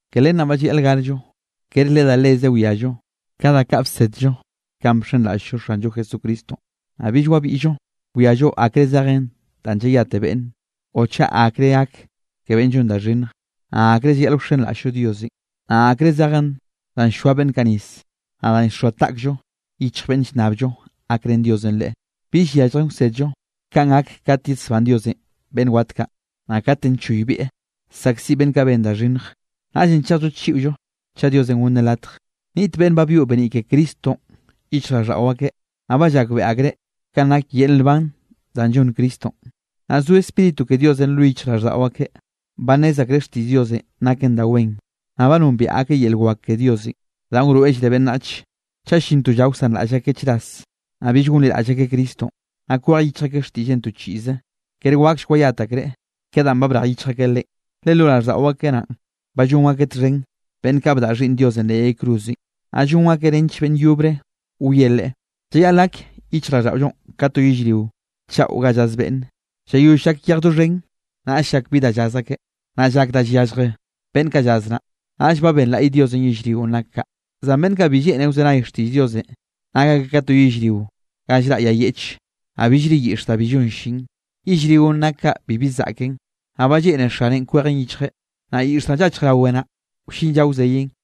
Ke len naꞌ ba llayaꞌl garllo, kere le da leze wiallo ka da kaꞌ bsedllo kanꞌ bxenraꞌll-llo Xanllo Jesucristonꞌ, naꞌ bill wabiꞌllo wiallo akre zejen danꞌ llayate beꞌnn, o chaꞌ akre gak ke beꞌnn llon da xhinnj, naꞌ akre llayaꞌl wxenraꞌll-llo Diosenꞌ, naꞌ akre zejen danꞌ llchoaꞌ beꞌnn kaꞌ nis, naꞌ danꞌ llxoa taꞌkllo yichj beꞌnne llnnabllo gakrén Diosenꞌ leꞌe. Bill yalljen wsedllo kanꞌ gak kat yesbán Diosenꞌ beꞌnn wat kaꞌ, naꞌ katenꞌ choybieꞌ saꞌkziꞌ beꞌnn kaꞌ ben da xhinnje. Naꞌllenꞌ chejll-llo chiꞌollo chaꞌ Diosenꞌ gonneꞌ latj. Niꞌt beꞌnn ba byoꞌ beniꞌ ke Cristonꞌ yichjraꞌlldaꞌo akeꞌ, naꞌ ba llakbeꞌe akreꞌ kanꞌ nak yel nban danꞌ llonn Cristonꞌ, naꞌ zo Spíritu ke Diosenꞌ lo yichjraꞌlldaꞌo akeꞌ. Ba nnez akreꞌ xtiꞌll Diosenꞌ naken da wen, naꞌ ba nombiaꞌ akeꞌ yel wak ke Diosenꞌ danꞌ wroeꞌllreꞌ beꞌnnache. Chaꞌ llin to lla wsanraꞌll akeꞌ chras, naꞌ bill gonliraꞌll akeꞌ Cristonꞌ, naꞌ kwej yichj akeꞌ xtiꞌlleꞌn to chiꞌze, kere waklle wayat akreꞌ ke danꞌ ba brej yichj akeꞌ Leꞌen, le lo raꞌlldaꞌo akeꞌ naꞌn, ba llon akeꞌ txhen beꞌnn kaꞌ bdaꞌa Xhiꞌnn Diosenꞌ leꞌ yay cruzenꞌ, naꞌ llon akeꞌ nench beꞌnn yobre wieꞌ Leꞌe. Llayaꞌl gak yichjraꞌlldaꞌollonꞌ ka to yellrio chaꞌo ga llaz beꞌnne. Llayoll llak yejenꞌ doxhen, naꞌll llak bi da llaz akeꞌ. Naꞌ llak da yallje beꞌnn kaꞌ llaz naꞌ. Naꞌll ba benlaꞌy Diosenꞌ yellrionꞌ nak kaꞌ. Zan beꞌnn kaꞌ bi lleꞌne wzenay xtiꞌll Diosenꞌ, nak akeꞌ ka to yellrio ga llraꞌ yay yeꞌche, naꞌ billre yiꞌx da bi llon llin. Yellrionꞌ nak kaꞌ bibi zaꞌken, naꞌ ba lleꞌne xaneꞌn kwejeꞌn yichjeꞌ, naꞌ yiꞌx danꞌ llachj rawe naꞌ, wllin lla wzeyeꞌn.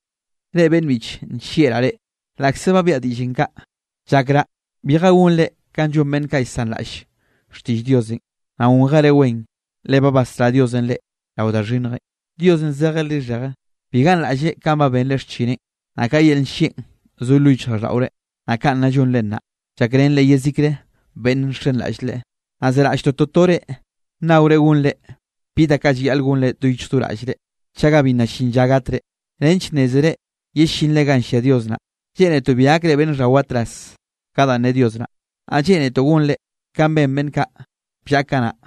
Reꞌ beꞌnn biꞌche, nllieꞌraꞌ reꞌ, laꞌkze ba biaꞌa diꞌllenꞌ kaꞌ, llakraꞌ bije gonre kanꞌ llon beꞌnn kaꞌ llsanraꞌll xtiꞌll Diosenꞌ, naꞌ gonjere wen, le ba basrá Diosenꞌ reꞌ rao da xhinnjenꞌ. Diosenꞌ zejeꞌ lixheje, bi ganraꞌlleꞌ kanꞌ ba benre xchineꞌn, naꞌ ka yel nllieꞌn zo lo yichjraꞌlldaꞌore, naꞌ kanꞌ nna llonre nnaꞌ, llakrenre yezikre beꞌnne nxenraꞌll Leꞌe. Naꞌ zeraꞌlltoꞌ totore nnaore gonre bi da kaꞌ llayaꞌl gonre do yichj do raꞌllre, chaga bi nna llin lla gatre, nench nnézere yellinre ganꞌ llia Dios naꞌ. Lleꞌnetoꞌ bi gakre beꞌnn xhawatraz ka danꞌ ne Dios naꞌ. Naꞌ lleꞌnetoꞌ gonre kanꞌ ben beꞌnn kaꞌ bllaꞌa kanaꞌ,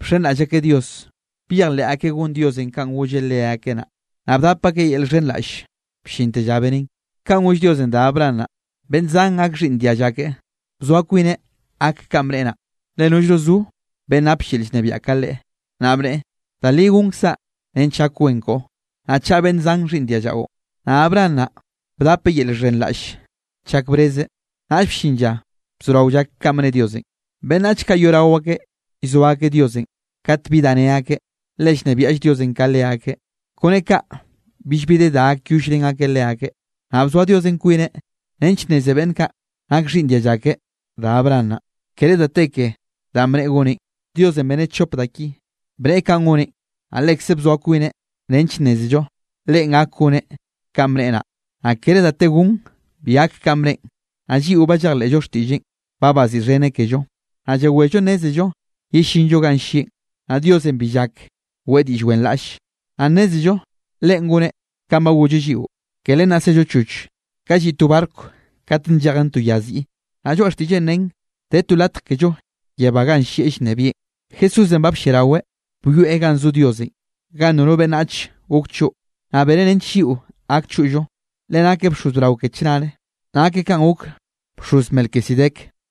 bxenraꞌll akeꞌ Dios, byejleꞌ akeꞌ gon Diosenꞌ kanꞌ golleꞌ leakeꞌ naꞌ, naꞌ bdap akeꞌ yel llxhenraꞌll bllinte lla beneꞌn. Kanꞌ goll Diosenꞌ da Abraham naꞌ, beꞌnn zan gak xhiꞌnn dialla keꞌe, bzoa kwineꞌ gak kanꞌ bneꞌe naꞌ, le nollno zo beꞌnn napll yel llnebiaꞌ ka Leꞌe. Naꞌ bneꞌe: “Da li gonkzaꞌ nench gak wen koꞌo, naꞌ chaꞌa beꞌnn zan xhiꞌnn diallaꞌo.” Naꞌ Abraham naꞌ bdapeꞌ yel llxhenraꞌll chak brezeꞌ, naꞌll bllin lla bzorao llak kanꞌ bne Diosenꞌ. Beꞌnnach kaꞌ yoꞌrao akeꞌ llzo akeꞌ Diosenꞌ kat bi da ne akeꞌ, le llnebiaꞌll Diosenꞌ ka leakeꞌ. Kone kaꞌ billbi de da gakyollrén akeꞌ leakeꞌ. Naꞌ bzoa Diosenꞌ kwineꞌ nench nneze beꞌnn kaꞌ nak xhiꞌnn dialla ke da Abraham naꞌ, kere da te ke danꞌ bneꞌe goneꞌn. Diosenꞌ beneꞌ chop da ki: bneꞌe kanꞌ goneꞌ, naꞌ lekzeꞌ bzoa kwineꞌ nench nnézello Leꞌen gak goneꞌ kanꞌ bneꞌe naꞌ, naꞌ kere da te gon bi gak kanꞌ bneꞌen. Naꞌ lliꞌo ba llejleꞌllo xtiꞌlleꞌn, ba baziꞌxheneꞌ kello, naꞌ yewello nnézello yellinllo ganꞌ llieꞌn, naꞌ Diosenꞌ bi llak weꞌe diꞌll wenraꞌlle. Naꞌ nnézello Leꞌen goneꞌ kanꞌ ba golleꞌ lliꞌo. Ke len naꞌ zello choch, ka lliꞌ to barco kat nllejen to ya ziꞌi, naꞌ lloaꞌ xtiꞌlleꞌn nen de to latj kello yebá ganꞌ llieꞌ llnebieꞌn. Jesúsenꞌ ba blliaraweꞌ byoeꞌ ganꞌ zo Diosenꞌ, ganꞌ nono beꞌnnach gok choꞌ, naꞌ beneꞌ nench lliꞌo gak choꞌllo. Le nakeꞌ bxoz brao ke chnare, nakeꞌ kanꞌ gok bxoz Melquisedec.